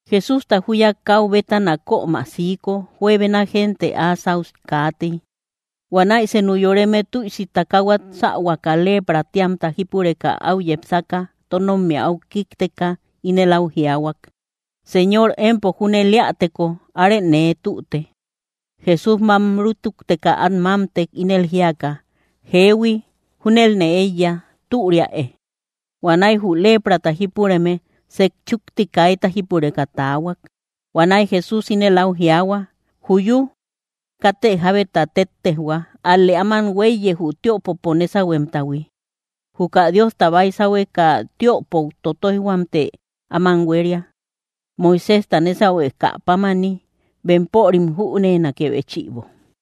Jesústa júya káu bétana kömä siiko juebena gente áa sáu kaatey. Huanäi senu yoreme tüisi takahuat sähuaka leprä tíamta jípureka áu yepsaka tónommia áu kíkteka, ínel áu jiaahuak: —Señor, empo júnel éäteko, arë nee tüte. Jesús mám rútukteka át mámtek, ínel jíaka: —Jeehui, júnelne éiya; türiäe. Huanäi jü leprata jípureme sejchúkti kaita jípureka taahuak. Huanäi Jesús ínel áu jiaahua: —¡Juyú! Katë jábeta téttejhua, ál‑lë áman huéiye, jü tiöpopo nésahuemtahui. Juka Diosta baysahueka tiöpou totoijhuamtë áman huéria, Moiséjta nésahuekä pámani, bempörim jüneenakë béchïbo.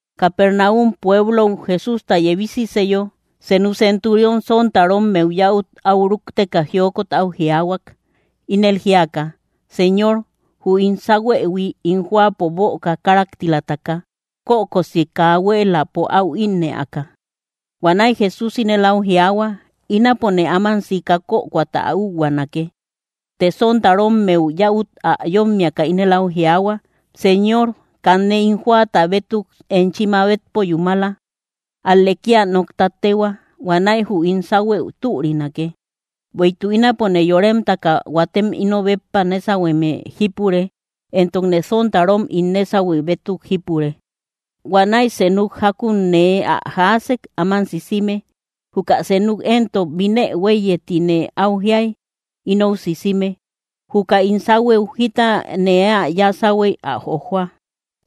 Capernaum pueblou Jesústa yebisiseyo, senu centurión sontarommeu yäut áu rukteka jiokot áu jiaahuak, ínel jíaka: —Señor, jü ín sáhuëhui ín jóapo böka káraktilataka, kökosi kaa huéeläpo áu ínnëaka. Huanäi Jesús ínel áu jiaahuak: —Ínapone áman sika kökoata ä úhuaanake. Të sontarommeu yäut ä yómmiaka ínel áu jiaahuak: —Señor, kanne ín jóata bétuk enchi mabetpo yúmala; ál‑lë kía nokta téhua; huanäi jü ín sáhuëu türinake. Bueïtuk ínapone yóremtaka huatem ino béppa nésahueme jípure, entokne sontarom ín nésahue bétuk jípure. Huanäi senuk jákun nee ä jaasek áman sisime; juka senuk éntok: “Binë huéiye”, ti nee áu jiay inou sisime; juka ín sáhuëu jita nee ä yáa sáhuey, ä jojoa.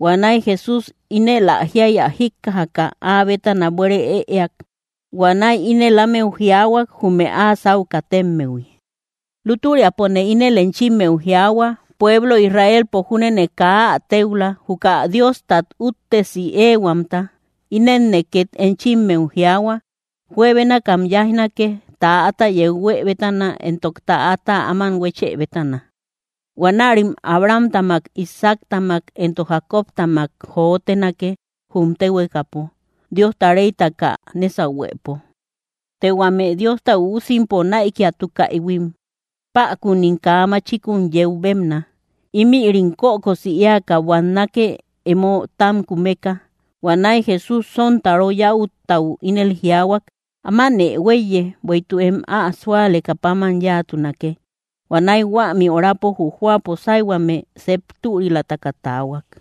Huanäi Jesús ínel ä jiay ä jíkkajaka, áa bétana buére ëeak. Huanäi ínel ámeu jiaahuak, jume áa sáu katemmehui: —Lútüriapone ínel enchimmeu jiaahua, pueblo Israelpo júnene kaa ä téula, juka Diostat úttesi éehuamta. Inenne két enchimmeu jiaahua, juebénakam yáijnake, täata yeu huë bétana entok täata áman huéchë bétana; huanärim Abrahamtamak, Isaactamak entok Jacobtamak jotenake, jum téhuekapo Diosta réytaka nésahuepo. Të huame Diosta üusimpo näikiatukaïhuim, päkunim kaa machikun yeu bébna; ímïrim kökosi éaka buannake, emo tám kumeka. Huanäi Jesús sontaro yäuttau ínel jiaahuak: —Ámanë huéiye, bueïtuk em ä súalekä páman yáatunake. Huanäi huämi orapo jü jóapo sáyhuame sep türilataka taahuak.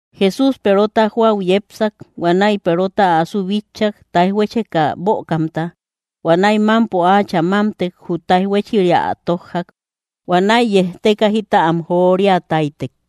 Jesús Perota jóau yepsak. Huanäi Perota asu bitchak, táij huécheka bökamta. Huanäi mámpo áachä mámtek, jü táij huéchiria ä tójjak; huanäi yejteka jita am joria táytek.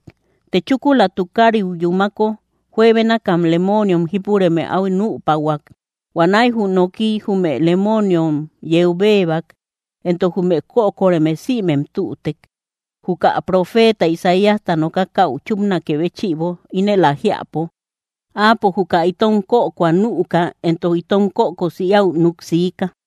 Të chúkula tukariu yúmako, juebénakam lemooniom jípureme áu nüpahuak; huanäi jü nokiy jume lemooniom yeu béebak, entok jume kökoreme sïmem tütek, jukä profeeta Isaíasta nokakäu chúpnakë béchïbo, ínëli ä jiäpo: “Áapo juka itom kökoa nüka entok itom kökosi éäu núk siika.”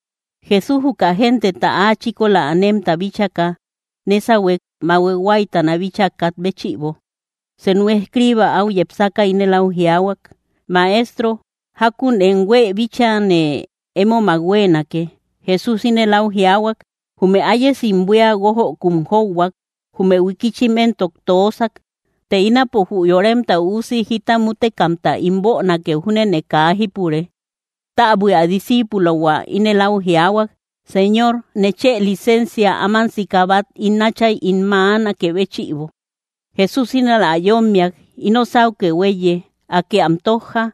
Jesús juka genteta áa chíkola anemta bíchaka, nésahuek bahue huáytana bíchaa kat béchïbo. Senu escriiba áu yepsaka ínel áu jiaahuak: —Maestro, jákun em huëu bíchane émomak huéenake. Jesús ínel áu jiaahuak: —Jume ayesim buía guojökum jóuhuak; jume huikichim éntok toosak; të ínapo jü Yoremta Üusi jita mútekaka ín bönakeu júnene kaa jípure. Täbui, ä disciipulohua ínel áu jiaahuak: —Señor, nechë licensia áman sika bát ín áchay ín mäanakë béchïbo. Jesús ínel ä yómmiak: —Ino sáukë huéiye, Akë am tójja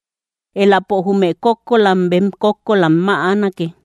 eläpo jume kókkolam bem kókkolam mäanake.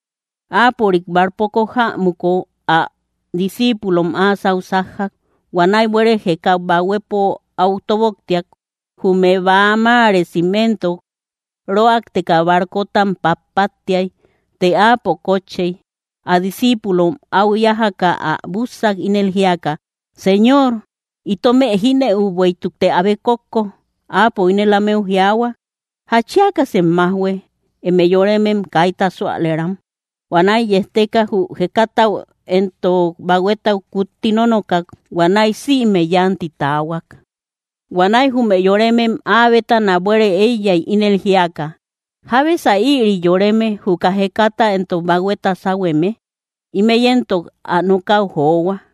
Áapörik barcopo jämuko, ä discíipulom áa sáu sájjak. Huanäi buere jéka bahuepo áu tóboktiak; jume bäa máresim éntok röakteka barcotam patpattiay; të Áapo kótchey. Ä discíipulom áu yájaka ä bússak, ínel jíaka: —Señor, ¡itomë jínëu, bueïtukte abe kókko! Áapo ínel ámeu jiaahua: —¿Jatchiakasem májhue, eme yoremem kaita súalëram? Huanäi yejteka, jü jekatau entok bahuetau kutti nónokak; huanäi sïme yánti taahuak. Huanäi jume yoremem áa bétana buére éiyay, ínel jíaka: —¿Jábesa ïri yoreme, juka jekata entok bahueta sáhueme? ¡Ímëi éntok ä nokäu johua!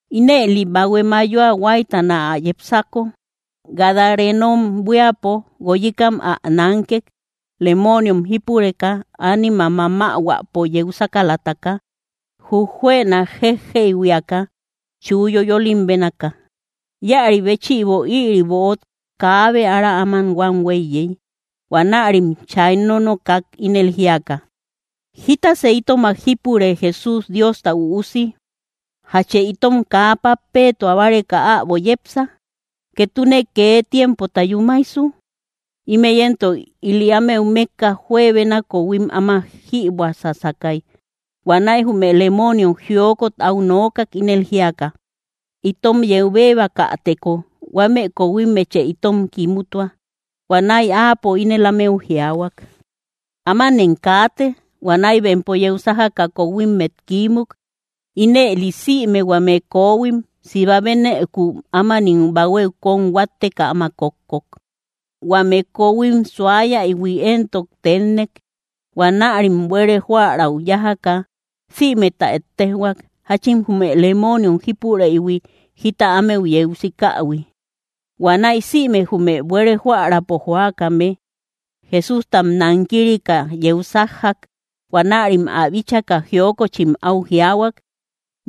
Ínëli bahue mayoa huáytana ä yepsako, gadarenom buiapo, guoyikam ä nánkek, lemooniom jípureka, ánimam mamahuäpo yeu sákalataka; jujuëna jéjjeyhuiaka chuu yoyolim bénaaka. Íäri béchïbo ïri böot kaabe ára áma huam huéiyey. Huanärim chay nónokak, ínel jíaka: —¿Jítasë itomak jípure, Jesús, Diosta Üusi? ¿Jachë itom kaa pappeetua báreka äbo yepsa, ketune kee tiempota yúmaisu? Ímï éntok ili ámeu mékka juebena kohuim áma jïbuä sásakay. Huanäi jume lemooniom jiokot áu nookak, ínel jíaka: —Itom yeu béebakäteko, huame kohuimmechë itom kimutua. Huanäi Áapo ínel ámeu jiaahuak: —Ámanem kaate. Huanäi bempo yeu sájaka kohuimmet kiímuk; ínëli sïme huame kohuim siba bénëku ámanim bahuéu kón huátteka áma kókkok. Huamë kohuim suayaïhui éntok tennek. Huanärim buere jóärau yájaka sïmeta ettejhuak, jáchin jume lemooniom jípureïhui jita ámeu yeu sikähui. Huanäi sïme jume buere jóäraapo jóakame, Jesústam nankirika yeu sájjak. Huanärim ä bíchaka jiokochim áu jiaahuak,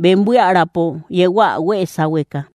bem buíäraapo yehuä huée sáhueka.